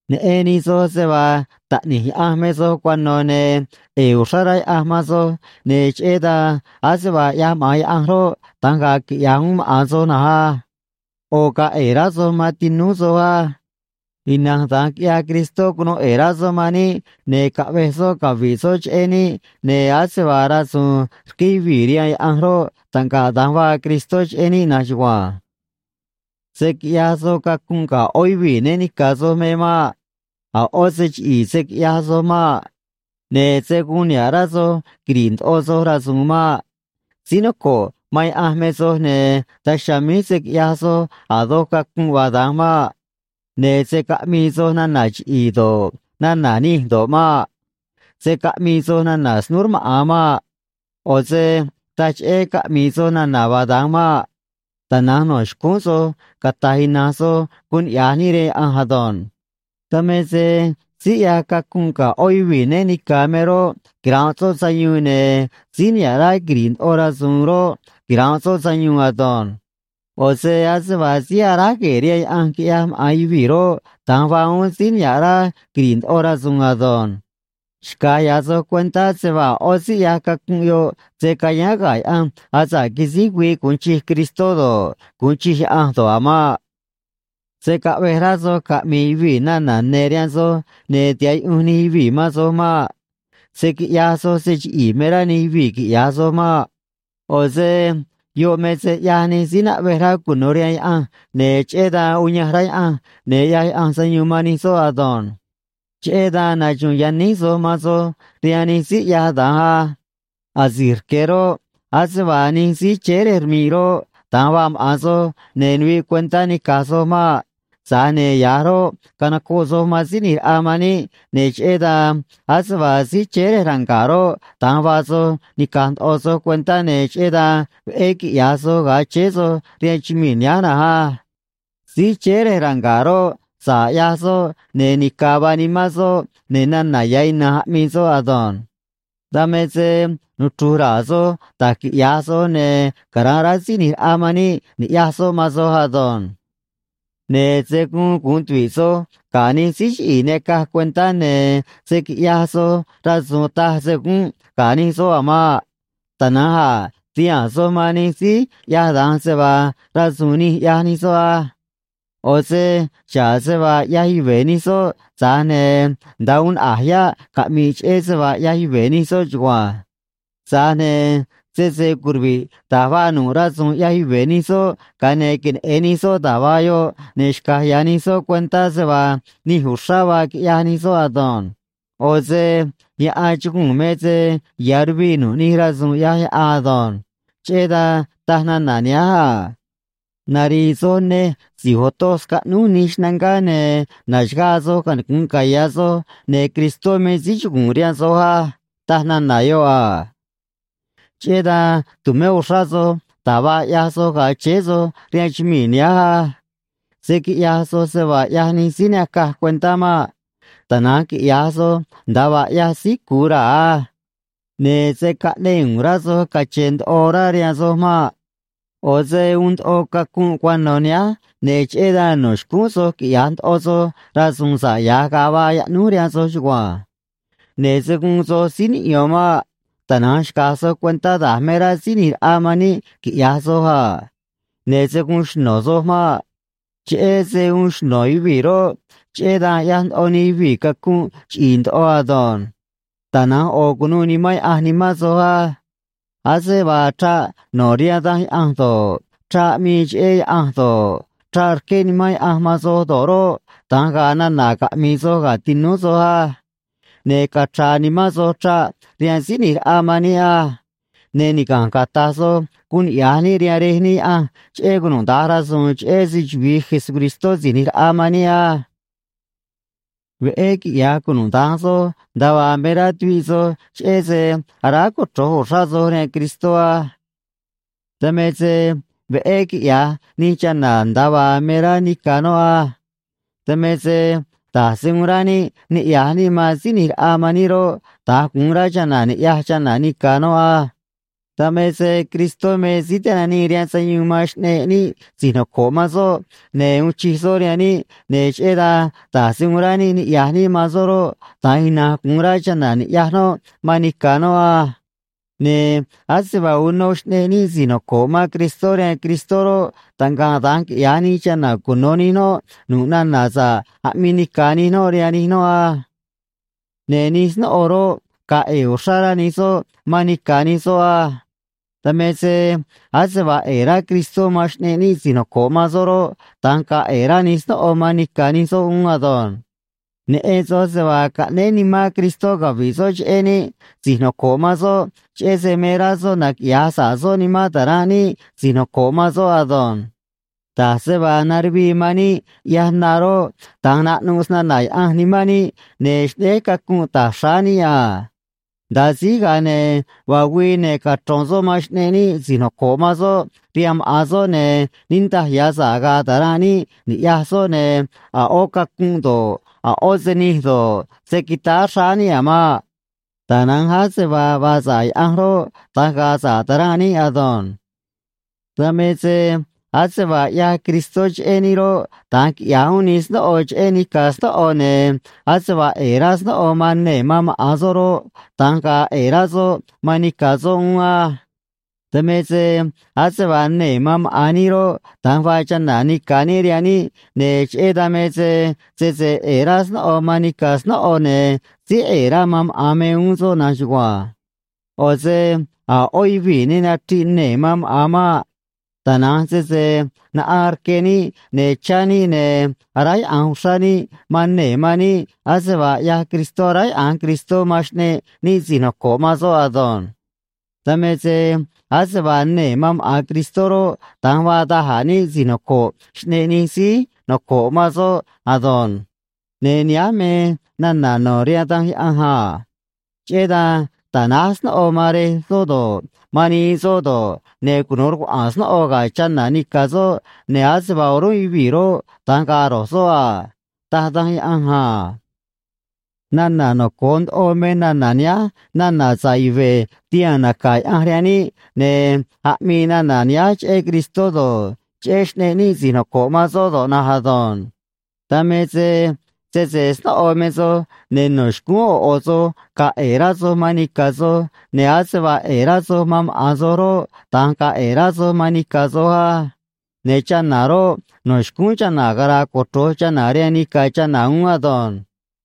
Neꞌen nij soj se vaa taꞌni̱j Yaꞌanj me soj cuano̱, ne̱ ꞌe̱e̱ uxrá rá Yaꞌanj man soj, ne̱ cheꞌé dan ase vaa ꞌyaj maꞌa̱n Yaꞌanj roꞌ, da̱nj ga̱a̱ quiꞌya̱j uún maꞌa̱n soj na̱nj á. ꞌO̱ ga̱a̱ ꞌe̱e̱ rá soj man tinúú soj á. Ina̱nj da̱nj quiꞌyaj Cristó, cunuu ꞌe̱e̱ rá soꞌ man níꞌ, ne̱ caꞌvej soꞌ cavi̱ꞌ soꞌ cheꞌé níꞌ, ne̱ ase vaa rasu̱u̱n rqué yuvii̱ rihaan Yaꞌanj roꞌ, taꞌngaꞌ da̱nj vaa Cristó cheꞌé níꞌ na̱nj chugua̱nj. Se̱ quiꞌyaj soj cacunꞌ ga̱ ꞌó yuvii̱ né ni̱ca̱ soj me maꞌ. A̱ ꞌó se chiꞌi̱i̱ se̱ quiꞌyaj soj maꞌ. Ne̱ se̱ guun niha̱ꞌ rá soj quiri̱ꞌ ndoꞌo soj rasu̱u̱n maꞌ. Síí noco̱ꞌ man Yaꞌanj me soj, ne̱ daj chiha̱a̱ míj se̱ quiꞌyaj soj a̱ doj cacunꞌ vaa da̱nj maꞌ. Ne̱ se̱ caꞌmii soj nana̱ chiꞌi̱i̱ do̱ꞌ, nana̱ nij do̱ꞌ maꞌ. Se̱ caꞌmii soj nana̱ snúú rmaꞌa̱n maꞌ. ꞌO̱ se taj cheꞌé caꞌmi̱i̱ soj nana̱ vaa da̱nj maꞌ. Tana̱nj no̱ xcúún soj cata̱j ina̱nj soj guun niꞌya̱j níꞌ rihaan Yaꞌanj ado̱nj. Dan me se síí ꞌyaj cacunꞌ ga̱ ꞌó yuvii̱ né ni̱ca̱ me roꞌ, quira̱nꞌ soꞌ sayuun, ne̱ síí niha̱ꞌ rá quiri̱ꞌ ndoꞌo rasu̱u̱n roꞌ, quira̱nꞌ soꞌ sayuun ado̱nj. (ꞌO̱ se ase vaa síí aráj gue̱e̱ rihaan yaꞌanj quiꞌyaj maꞌa̱n yuvii̱ roꞌ, da̱nj vaa uún síí niha̱ꞌ rá quiri̱ꞌ ndoꞌo rasu̱u̱n ado̱nj.) Xca̱j ya̱ soj cuentá se vaa a̱ ꞌó síí ꞌyaj cacunꞌ yoꞌ se̱ cayáán ga̱ Yaꞌanj asa̱ꞌ quisíj güii gu̱un chij Cristó do̱ꞌ, gu̱un chij Yaꞌanj do̱ꞌ a̱ maꞌ. Se̱ caꞌvej rá soj caꞌmi̱i̱ yuvii̱ nana̱ ne̱ rihaan soj ne̱ tiha̱ꞌ yuꞌunj nij yuvii̱ man soj maꞌ. Se̱ quiꞌyaj soj se chiꞌi̱i̱ me rá nij yuvii̱ quiꞌya̱j soj maꞌ. ꞌO̱ se yoꞌ me se ꞌyaj nij síí naꞌvej rá cuno̱ rihaan Yaꞌanj, ne̱ cheꞌé dan uyanj rá Yaꞌanj, ne̱ ꞌyaj Yaꞌanj sayuun man nij soꞌ ado̱nj. Cheꞌé dan naxu̱u̱n yaníj soj man soj rihaan nij síí ꞌyaj da̱nj á. Asi̱j rque̱ roꞌ, ase vaa nij síí chéé rej rmi̱ꞌ roꞌ, da̱nj vaa maꞌa̱n soj, ne̱ nuviꞌ cuentá nica̱j soj maꞌ. Tza̱j ne̱ ya̱j roꞌ, canocoꞌ soj man Síí ꞌNi̱j Raꞌa man níꞌ, ne̱ cheꞌé dan ase vaa síí chéé rej ranga̱ꞌ roꞌ, da̱nj vaa soj, nica̱j ndoꞌo soj cuentá, ne̱ cheꞌé dan veꞌé quiꞌya̱j soj ga̱a chéé soj rihaan chumii̱ nihánj na̱nj á. Síí chéé rej ranga̱ꞌ roꞌ, sa̱ꞌ ꞌyaj soꞌ, ne̱ nica̱ vaa nimán soꞌ, ne̱ nana̱ ya̱ ina̱nj aꞌmii soꞌ ado̱nj. Dan me se nuchru̱j ra̱a̱ soj da̱j quiꞌya̱j soj, ne̱ cara̱nꞌ rá Síí ꞌNi̱j Raꞌa man níꞌ ni̱ꞌyaj soꞌ man soj ado̱nj. Ne̱ se̱ guun gu̱un tuvi̱ꞌ soj ga̱ nij síí chiꞌi̱i̱ ne acaj cuentá, ne̱ se̱ quiꞌyaj soj rasu̱u̱n taj se gúnꞌ ga̱ nij soꞌ a̱ maꞌ. Tana̱nj a̱ ti̱haa̱n soj man nij síí ꞌyaj da̱nj se vaa rasu̱u̱n nij ꞌyaj nij soꞌ á. ꞌO̱ se xa̱ꞌ se vaa ꞌyaj yuve̱ nij soꞌ, tza̱j ne̱ nda̱a uun naꞌa̱j yáꞌ caꞌmi̱ꞌ cheꞌé se vaa ꞌyaj yuve̱ nij soꞌ chugua̱nj. Tza̱j ne̱ sese curuvi̱ꞌ da̱j vaa nu̱ꞌ rasu̱u̱n ꞌyaj yuve̱ nij soꞌ, ga̱a ne̱ queneꞌe̱n nij soꞌ da̱j vaa yoꞌ, ne̱ xca̱j ya̱ nij soꞌ cuentá se vaa nij uxrá vaa quiꞌyaj nij soꞌ ado̱nj. ꞌO̱ se yaꞌan chuguu̱n me se ya̱ ruviꞌ nu̱ꞌ nij rasu̱u̱n ꞌyaj yaꞌan ado̱nj. Cheꞌé dan taj nana̱ nihánj a: Nari̱i̱ soj nej, si̱j otoj scaꞌnúj nij xnangá, ne̱ na̱xagaa soj, canicu̱nꞌ caya̱ soj, ne̱ Cristó me síí chugu̱u̱n rihaan soj á, taj nana̱ yoꞌ a. Cheꞌé dan tu̱mé uxrá soj da̱j vaa ꞌyaj soj ga̱a chéé soj rihaan chumii̱ nihánj á. Se̱ quiꞌyaj soj se vaa ꞌyaj nij síí ne acaj cuentá maꞌ. Tana̱nj quiꞌya̱j soj nda̱a vaa ꞌyaj síí cu̱u raa̱ á. Ne̱ se̱ caꞌneꞌ u̱u̱n rá soj cache̱n ndoꞌo orá rihaan soj maꞌ. ꞌO̱ se uun ndoꞌo cacunꞌ cuano̱ nihánj, ne̱ cheꞌé dan no̱ xcúún soj quiꞌya̱j ndoꞌo soj rasu̱u̱n sa̱ꞌ ya̱j ga̱a vaa yaꞌnúj rihaan soj chugua̱nj. Ne̱ se̱ guun soj síí niꞌyo̱n maꞌ. Tana̱nj xca̱j soj cuentá da̱j me rá Síí ꞌNi̱j Raꞌa man níꞌ quiꞌya̱j soj a. Ne̱ se̱ guun xno̱ soj maꞌ. Cheꞌé se uun xno̱ yuvii̱ roꞌ, cheꞌé dan ꞌyaj ndoꞌo nij yuvii̱ cacunꞌ chiꞌi̱i̱ ndoꞌo ado̱nj. Tana̱nj ꞌo̱ cu̱nuû Nimán Yaꞌanj nimán soj á. Ase vaa chraꞌ no̱ rihaan Danj Yaꞌanj do̱ꞌ, chraꞌ aꞌmii cheꞌé Yaꞌanj do̱ꞌ, chraꞌ rqué Nimán Yaꞌanj man soj do̱ꞌ roꞌ, da̱nj ga̱a̱ nana̱ caꞌmi̱i̱ soj ga̱ tinúú soj á. Ne̱ cachra̱a̱ nimán soj chraꞌ rihaan Síí ꞌNi̱j Raꞌa man níꞌ á. Ne̱ niga̱nj cata̱j soj guun niꞌya̱j níꞌ rihaan Rej níꞌ Yaꞌanj cheꞌé cunuda̱nj rasu̱u̱n, cheꞌé se‑chuvi̱i Jesucristó Si̱j ꞌNi̱j Raꞌa man níꞌ á. Veꞌé quiꞌya̱j cunuda̱nj soj nda̱a vaa me rá tuviꞌ soj cheꞌé se aráj cochro̱j uxrá soj rihaan Cristó á. Dan me se veꞌé quiꞌya̱j nij chana̱ nda̱a vaa me rá nica̱ noꞌ á. Dan me se da̱j se uun rá níꞌ niꞌya̱j níꞌ man Síí ꞌNi̱j Raꞌa man níꞌ roꞌ, da̱nj gu̱un rá chana̱ ni̱ꞌyaj chana̱ nica̱ noꞌ á. Dan me se Cristó me Síí Tinanii rihaan Sayuun man xꞌneꞌ níꞌ si̱j noco̱ꞌ man soꞌ, ne̱ uun chij soꞌ rihaan níꞌ, ne̱ cheꞌé dan da̱j se uun rá níꞌ niꞌya̱j níꞌ man soꞌ roꞌ, da̱nj ina̱nj gu̱un rá chana̱ ni̱ꞌyaj noꞌ man nica̱ noꞌ á. Ne̱ ase vaa uno xꞌneꞌ níꞌ si̱j noco̱ꞌ man Cristó rihaan Cristó roꞌ, taꞌngaꞌ da̱nj quiꞌya̱j nij chana̱ cuno̱ nij noꞌ nu̱ꞌ nana̱ sa̱ꞌ aꞌmii nica̱ nij noꞌ rihaan nij noꞌ á. Ne̱ nij snóꞌo roꞌ, ga̱a̱ ꞌe̱e̱ uxrá rá nij soꞌ man nica̱ nij soꞌ á. Dan me se ase vaa ꞌe̱e̱ rá Cristó man xꞌneꞌ níꞌ si̱j noco̱ꞌ man soꞌ roꞌ, da̱nj ga̱a̱ ꞌe̱e̱ rá nij snóꞌo man nica̱ nij soꞌ uún ado̱nj. Neꞌen soj se vaa caꞌnéé nimán Cristó cavi̱ꞌ soꞌ cheꞌé níꞌ si̱j noco̱ꞌ man soꞌ, cheꞌé se me rá soꞌ naquiꞌya̱j sa̱ꞌ soꞌ nimán ta̱ranꞌ níꞌ si̱j noco̱ꞌ man soꞌ ado̱nj. Da̱j se vaa naruvii man níꞌ ꞌyaj na roꞌ, da̱nj naꞌnuꞌ snana̱ Yaꞌanj nimán níꞌ ne̱ xꞌnéj cacunꞌ ta̱j xráá níꞌ a. Nda̱a síj, ga̱a ne̱ vaa güii, ne̱ cachro̱n soꞌ man xꞌneꞌ níꞌ si̱j noco̱ꞌ man soꞌ rihaan maꞌa̱n soꞌ, ne̱ niꞌndaj ya̱ sa̱ꞌ ga̱a̱ ta̱ranꞌ níꞌ ni̱ꞌyaj soꞌ, ne̱ a̱ ꞌó cacunꞌ do̱ꞌ, a̱ ꞌó se nij do̱ꞌ, se̱ quitáá xráá níꞌ a̱ maꞌ. Tana̱nj ase vaa vaa sa̱ꞌ Yaꞌanj roꞌ, da̱nj ga̱a̱ sa̱ꞌ ta̱ranꞌ níꞌ ado̱nj. Dan me se ase vaa ꞌyaj Cristó cheꞌé níꞌ roꞌ, da̱nj quiꞌya̱j uún nij snóꞌo cheꞌé nica̱ snóꞌo, ne̱ ase vaa ꞌe̱e̱ rá snóꞌo man nee̱ man maꞌa̱n soꞌ roꞌ, da̱nj ga̱a̱ ꞌe̱e̱ rá soꞌ man nica̱ soꞌ uún á. Dan me se ase vaa nee̱ man maꞌa̱n níꞌ roꞌ, da̱nj vaa chana̱ nica̱ níꞌ rihaan níꞌ, ne̱ cheꞌé dan me se sese ꞌe̱e̱ rá snóꞌo man nica̱ snóꞌo, ne̱ síí ꞌe̱e̱ rá man maꞌa̱n me uún soꞌ na̱nj chugua̱nj. ꞌO̱ se a̱ ꞌó yuvii̱ ne nachriꞌ nee̱ man maꞌa̱n maꞌ. Tana̱nj sese naꞌaan rque níꞌ, ne̱ chá níꞌ, ne̱ aráyaꞌa̱nj uxrá níꞌ man nee̱ man níꞌ ase vaa ꞌyaj Cristó aráyaꞌa̱nj Cristó man xꞌneꞌ níꞌ si̱j noco̱ꞌ man soꞌ ado̱nj. Dan me se ase vaa nee̱ man maꞌa̱n Cristó roꞌ, da̱nj vaa da̱j a̱ níꞌ si̱j noco̱ꞌ xꞌneꞌ nij síí noco̱ꞌ man soꞌ ado̱nj. Ne̱ nihánj me nana̱ no̱ rihaan Danj Yaꞌanj a: “Cheꞌé dan ta̱náj snóꞌo man rej soꞌ do̱ꞌ, man nii soꞌ do̱ꞌ, ne̱ cunu̱u rucuaꞌa̱a̱n snóꞌo ga̱ chana̱ nica̱ soꞌ, ne̱ ase vaa o̱rúnꞌ yuvii̱ roꞌ, da̱nj ga̱a̱ ro̱j soꞌ a”, taj Danj Yaꞌanj a. Nana̱ noco̱o ndoꞌo me nana̱ nihánj nana̱ sa̱ꞌ yuve̱ tihaa̱n naca̱ Yaꞌanj rihaan níꞌ, ne̱ aꞌmii nana̱ nihánj cheꞌé Cristó do̱ꞌ, cheꞌé xꞌneꞌ níꞌ si̱j noco̱ꞌ man soꞌ do̱ꞌ na̱nj ado̱nj. Dan me se sese snóꞌo me soj, ne̱ no̱ xcúún ꞌo̱ ꞌo̱ soj ga̱a̱ ꞌe̱e̱ rá soj man nica̱ soj, ne̱ ase vaa ꞌe̱e̱ rá soj man maꞌa̱n soj roꞌ, da̱nj ga̱a̱ ꞌe̱e̱ rá soj man nica̱ soj á. Ne̱ chana̱ roꞌ, no̱ xcúún chana̱ cara̱a̱ cochro̱j chana̱ rihaan nica̱ chana̱ uún ado̱nj.